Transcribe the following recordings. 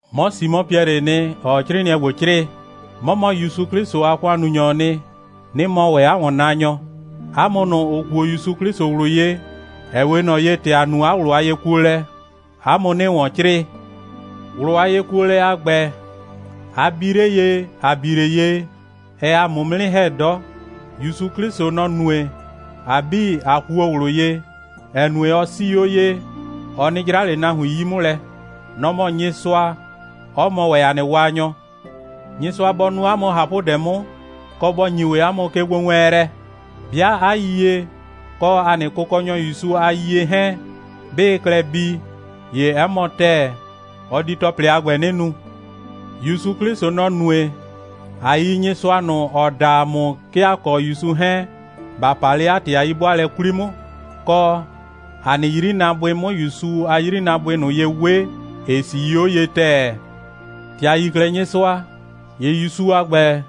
'Mɔ Simɔ Piɛlɩɩ nɩ, ‑ɔɔ 'crɩɩnɩɛ ‑gbo 'crɩɩ. 'Mɔ mɔ ‑Yusu 'Klɩsʋ a ‑kʋannunyɔɔ nɩ, 'nɩ mɔ ‑wɛ 'a ‑wɔnnaanyɔ. 'A mʋ ꞊nʋ, ‑ʋ kuo ‑Yusu 'Klɩsʋ ꞊wlʋ ye, ‑ɛ 'we ꞊nɔ ye, ‑tɛ ‑a nu 'a ꞊wlʋ a yekuolɛ, 'a mʋ 'nɩɩ ‑wɔn 'crɩɩ. ꞊Wlʋ a yekuolɛ a ‑gbɛ, a bi 'le ye, ‑a bi 'le ye, ɛɛ ‑a mʋ 'mʋ 'nɩ ‑hɛ 'dɔ. ‑Yusu 'Klɩsʋ, nɔ‑ nue, ‑a 'bii, ꞊a kuo ꞊wlʋ ye, ‑ɛ nue, ɔ 'sii 'o ye, ɔ 'nɩ 'jra ꞊le nahuin 'yi 'mʋ lɛ. Nɔ‑ mɔ Nyɩsʋa, 'ɔ mɔ ‑wɛ ‑a nɩ Waanyɔ. Nyɩsʋa bɔ nu 'a mʋ ꞊hapʋdɛ 'mʋ, kɔ, bɔ ‑nyi ‑wɛ 'a mʋ kegbowɛɛnlɛ. 'Bɩa 'a yiyie kɔ ‑a nɩ Kʋkɔnyɔ ‑Yusu a yiyie 'hɛɛn, 'bɩɩ klɛ bii, ‑ye 'ɛ mɔ ‑tɛɛ, ɔ di ‑tɔplɩ a ‑gbɛ 'nɩ nu. ‑Yusu 'Klɩsʋ, nɔ‑ nue, ꞊a yi Nyɩsʋa ꞊nʋ, ‑ɔ da ‑a mʋ, 'ke ‑a kɔ ‑Yusu 'hɛɛn, ‑ba pa 'le 'a ‑tɩ a 'yi'bʋaalɛ 'kwli 'mʋ, kɔ, ‑a nɩ 'yrinaabʋɩ 'mʋ ‑Yusu a 'yrinaabʋɩ ꞊nʋ ye 'we, ‑ɩ 'sii 'o ye ‑tɛɛ. ‑Tɛ ‑a yi 'klɛɛ Nyɩsʋa, ‑ye ‑Yusu a ‑gbɛ,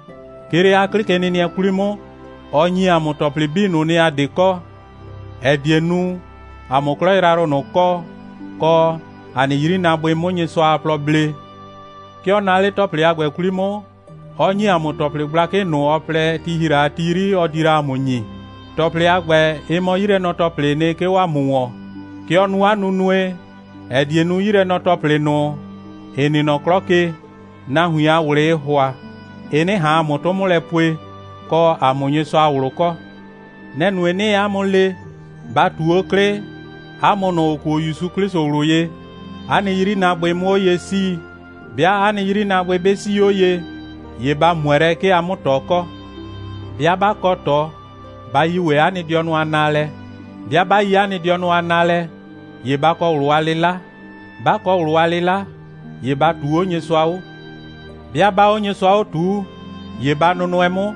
'ke 'le 'a 'klɩkenɩnɩɛ 'kwli 'mʋ, ɔ ‑nyi ‑a mʋ ‑tɔplɩ 'bii ꞊nʋ nɩ, ‑a 'de kɔ, ‑ɛ die nu, ‑a 'mʋ 'klɔ yrayrʋ ꞊nʋ kɔ, kɔ, ‑a nɩ 'yrinaabʋɩ 'mʋ Nyɩsʋa a plɔ blee. 'Ke ɔ naa 'le ‑tɔplɩ a ‑gbɛ 'kwli 'mʋ, 'ɔ ‑nyi ‑a mʋ ‑tɔplɩ gblakɩ ꞊nʋ, ɔ plɛ, ti ‑hi la a ti 'yri, ɔ di la ‑a mʋ ‑nyi. ‑Tɔplɩ a ‑gbɛ, ɩ mɔ 'yilɛnɔ‑tɔplɩɩ nɩ, 'ke 'o ‑a mʋ ‑wɔn. Kɛ ɔ nu 'a nunue, ‑ɛ die nu, 'yilɛnyre‑tɔplɩ ꞊nʋ, ‑ɩ nɩ nɔ 'klɔ ke, nahuin a ꞊wlɩɩ ‑hʋa, ɩ 'nɩ ꞊han 'a mʋ 'tʋ 'mʋ lɛ pue, kɔ, a 'mʋ Nyɩsʋa a ꞊wlʋ kɔ. Nɛ‑ nue, 'nɩɩ 'a mʋ le, ba ꞊tu 'o 'klɩ, 'a mʋ ꞊nʋ, ‑ʋ kuo ‑Yusu 'Klɩsʋ ꞊wlʋ ye, 'a nɩ 'yrinaabʋɩ 'mʋ 'o ye 'sii. 'Bɩa 'a nɩ 'yrinaabʋɩ 'bɩ 'sii 'o ye, ‑ye ba ꞊mʋɛ lɛ, 'ke a 'mʋ ꞊tɔ kɔ. 'Bɩa 'ba kɔ ꞊tɔ, ba yi ‑wɛ 'a nɩ dɩɔnʋ a naalɛ. 'Bɩa 'ba yi 'a nɩ dɩɔnʋ a naalɛ, ‑ye ba kɔ ꞊wlʋ a 'lɩla. 'Ba kɔ ꞊wlʋ a 'lɩla, ‑ye ba ꞊tuu 'o Nyɩsʋa 'o. 'Bɩa 'baa 'o Nyɩsʋa 'o ꞊tuu, ‑ye ba nʋnʋɛ 'mʋ,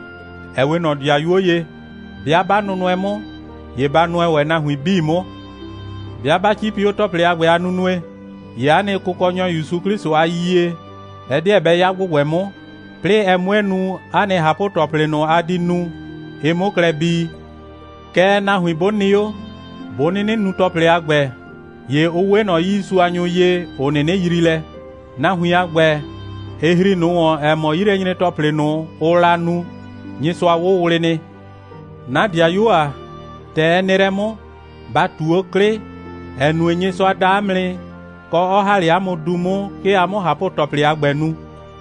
‑ɛ 'we ꞊nɔ ‑dɩayuo ye. 'Bɩa 'ba nʋnʋɛ 'mʋ, ‑ye ba nʋɛ ‑wɛ nahuin 'bii 'mʋ. 'Bɩa 'ba 'cipi 'o ‑tɔplɩ a ‑gbɛ a nunue, ‑ye 'a nɩ Kʋkɔnyɔ ‑Yusu 'Klɩsʋ a yiyie, ɛ 'deɛ bɛ 'ya ‑gbʋgbɛ 'mʋ, 'plɩɩ ɛ 'mue nu, 'a nɩ ꞊hapʋ‑tɔplɩ ꞊nʋ, a di nu, ɩ 'mʋ klɛ bii. Kɛɛ, nahuin 'bʋ nɩ 'o, 'bʋ 'nɩnɩ nu ‑tɔplɩ a ‑gbɛ, ‑ye ʋ 'we ꞊nɔ 'yiisuanyʋ ye, ‑ʋ 'nɩnɩ yrii lɛ. Nahuin a ‑gbɛ, ɩ ‑hri ꞊nʋ ‑wɔn, ‑ɛ mɔ, 'yilɛnyre‑tɔplɩ ꞊nʋ, ʋʋ la nu, Nyɩsʋa 'wʋwlɩ nɩ. 'Na ‑dɩayuo ‑a, ‑tɛ ɛ nɩ lɛ 'mʋ, ba ꞊tu 'o 'klɩ, ‑ɛ nue, Nyɩsʋa da 'a mʋ nɩ, kɔ, 'ɔ ‑ha 'le 'a mʋ du 'mʋ, 'ke a 'mʋ ꞊hapʋ‑tɔplɩ a ‑gbɛ nu.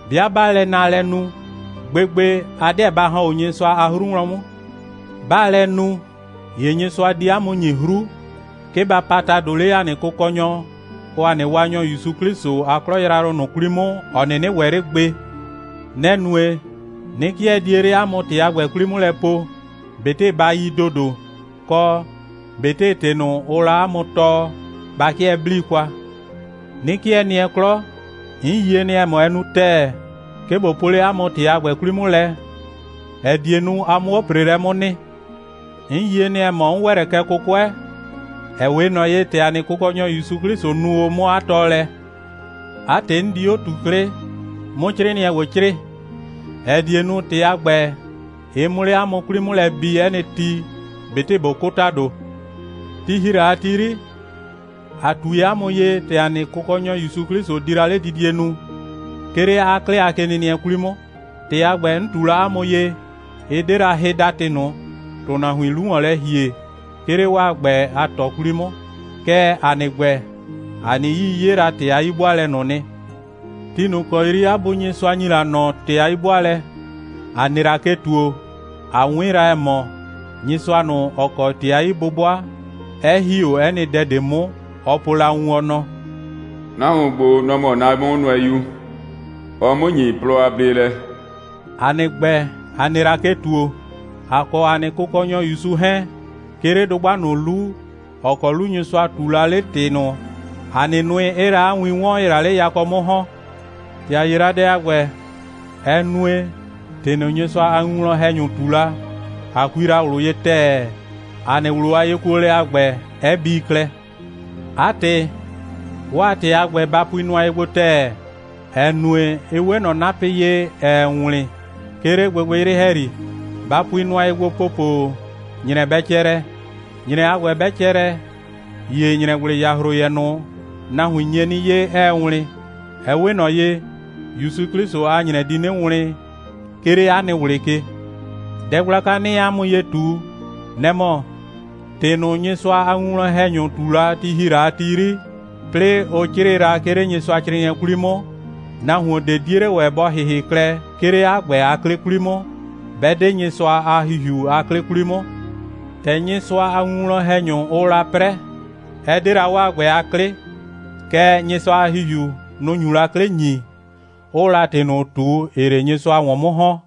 'Bɩa 'baa lɛ naalɛ nu, gbegbe, a 'deɛ ba ‑hɔn 'o Nyɩsʋa a 'hru wlɔn 'mʋ. 'Baa lɛ nu, ‑ye Nyɩsʋa di 'a mʋ ‑nyi 'hru, 'ke ba pa ‑tado 'le ‑a nɩ Kʋkɔnyɔ kɔ ‑a nɩ Waanyɔ ‑Yusu 'Klɩsʋ a 'klɔ yrayrʋ ꞊nʋ 'kwli 'mʋ, ‑ɔ 'nɩnɩ ‑wɛ 'le gbe. Nɛ‑ nue, 'nɩ 'kɩɛ die 'le 'a mʋ ‑tɩ a ‑gbɛ 'kwli 'mʋ lɛ po, ꞊betɩ ba yi ‑dodo, kɔ ꞊betɩ ‑tɩ ꞊nʋ, ʋʋ la 'a mʋ tɔɔ, ba 'kɩɛ 'blii kwa. 'Nɩ 'kɩɛ nɩɛ 'klɔ, 'n yie nɩ, ‑ɛ mɔ, ɛ nu ‑tɛɛ, 'ke ꞊bo po 'le 'a mʋ ‑tɩ a ‑gbɛ 'kwli 'mʋ lɛ, ‑ɛ die nu, a 'mʋ 'o ‑preelɛ 'mʋ nɩ. 'N yie nɩ, ‑ɛ mɔ, 'n ‑wɛ lɛ kɛ 'kʋkʋɛ, ‑ɛ 'we ꞊nɔ ye, ‑tɛ ‑a nɩ Kʋkɔnyɔ ‑Yusu 'Klɩsʋ nu o 'mʋ 'a tɔɔlɛ. 'A ‑tɩ, 'n di 'o ꞊tu 'klɩ, 'mʋ 'crɩɩnɩɛ ‑gbo 'crɩɩ, ‑ɛ die nu, ‑tɩ a ‑gbɛ, ɩ 'mʋ 'le 'a mʋ 'kwli 'mʋ lɛ bi 'ɛ nɩ ti, ꞊betɩ ꞊bo 'kʋ ‑tado. Ti ‑hi la a ti 'yri, ‑a ꞊tui 'a mʋ ye, ‑tɛ ‑a nɩ Kʋkɔnyɔ ‑Yusu 'Klɩsʋ di la 'ledidie nu, 'ke 'le 'a 'klɩ a kenɩnɩɛ 'kwli 'mʋ. ‑Tɩ a ‑gbɛ, 'n ꞊tu la 'a mʋ ye, ɩ 'de la hɩdatɩ ꞊nʋ, ‑tʋnahuiin 'lu ‑wɔn lɛ ‑hie, 'ke 'le 'waa ‑gbɛ a ꞊tɔ 'kwli 'mʋ. Kɛɛ, ‑a nɩ ‑gbɛ, ‑a nɩ 'yii 'ye la 'a ‑tɩ a 'yi'bʋaalɛ ꞊nʋ nɩ. Ti ꞊nʋ ‑kɔ 'yri 'a Bu Nyɩsʋa ‑nyi la ꞊nɔ ‑tɩ a 'yi'bʋaalɛ, ‑a nɩ la ke ‑tuo, ꞊a 'wɩn la, ‑ɛ mɔ, Nyɩsʋa ꞊nʋ, ‑ɔ kɔ ‑tɩ a 'yi'bʋbʋa, 'ɛ ‑hi 'o 'ɛ nɩ dɛ ꞊de 'mʋ, ɔ po la wun, ɔ nɔ: «Nahuon ‑gbo, nɔ‑ mɔ 'na 'Mʋnʋɛyu. Ɔɔ 'mʋ ‑nyi plɔ a bleelɛ.» ‑A nɩ ‑gbɛ, ‑a nɩ la ke ‑tuo, ‑a kɔ ‑a nɩ Kʋkɔnyɔ ‑Yusu 'hɛɛn, 'ke 'le dʋgba ꞊nʋ 'lu, ‑ɔ kɔ 'lu Nyɩsʋa ꞊tuu la 'le ‑tɩ ꞊nʋ, ‑a nɩ nʋɩ 'ɩɩ la 'a win 'wɔn, ‑ɩɩ la 'le yakɔ 'mʋ ‑hɔn. ‑Tɛ ‑a 'ye la dɛ a ‑gbɛ, ɛ nue, ‑tɩ ꞊nʋ, Nyɩsʋa a winwlɔn‑hɛnyʋ ꞊tu la, ꞊a kui ꞊wlʋ ye ‑tɛɛ, ‑a nɩ ꞊wlʋ a yekuolɛ a ‑gbɛ 'ɛ bii klɛ. 'A ‑tɩ, 'waa ‑tɩ a ‑gbɛ, ba pui nʋa ye gbo ‑tɛɛ, ‑ɛ nue, ɩ 'we ꞊nɔ 'napɩ ye, ‑ɛɛ wlɩn, 'ke 'le gbɩgbɩyrɩ ‑hɛyri. Ba pui nʋa ye gbo ‑popo, ‑nyrɛ bɛ cɛ lɛ. ‑Nyrɛ a ‑gbɛ 'bɛ cɛ lɛ, ‑ye ‑nyrɛgblɩyahroyɛ ꞊nʋ, nahuin nye 'nɩ 'ye, 'ɛɛ wlɩn. Ɛ 'we ꞊nɔ ye, ‑Yusu 'Klɩsʋ a ‑nyrɛ di 'nɩ wlɩn, 'ke 'le 'a nɩ ꞊wlɩ ke. Dɛ gblaka, 'nɩɩ 'a mʋ ye ꞊tu, nɛ‑ mɔ: ‑Tɩ ꞊nʋ, Nyɩsʋa a winwlɔn‑hɛnyʋ ꞊tu la, ti ‑hi la a ti 'yri, 'plɩɩ ʋ 'crɩɩ la, 'ke 'le Nyɩsʋacrɩɩnɩɛ 'kwli 'mʋ, nahuon ꞊de 'die 'le ‑wɛ, bɔ ‑hɩhɩ klɛ, 'ke 'le 'a ‑gbɛ a 'klɩ 'kwli 'mʋ, 'bɛ 'de Nyɩsʋa a ‑Hihiu a 'klɩ 'kwli 'mʋ. ‑Tɛ Nyɩsʋa a winwlɔn‑hɛnyʋ, ʋʋ la 'prɛ, ɛ 'de la 'waa ‑gbɛ a 'klɩ, kɛɛ, Nyɩsʋa a ‑Hihiu, nʋ‑ nyu la 'klɩ ‑nyi, 'ʋʋ la ‑tɩ ꞊nʋ ꞊tu, ‑ɩɩ 'le Nyɩsʋa ‑wɔn 'mʋ ‑hɔn.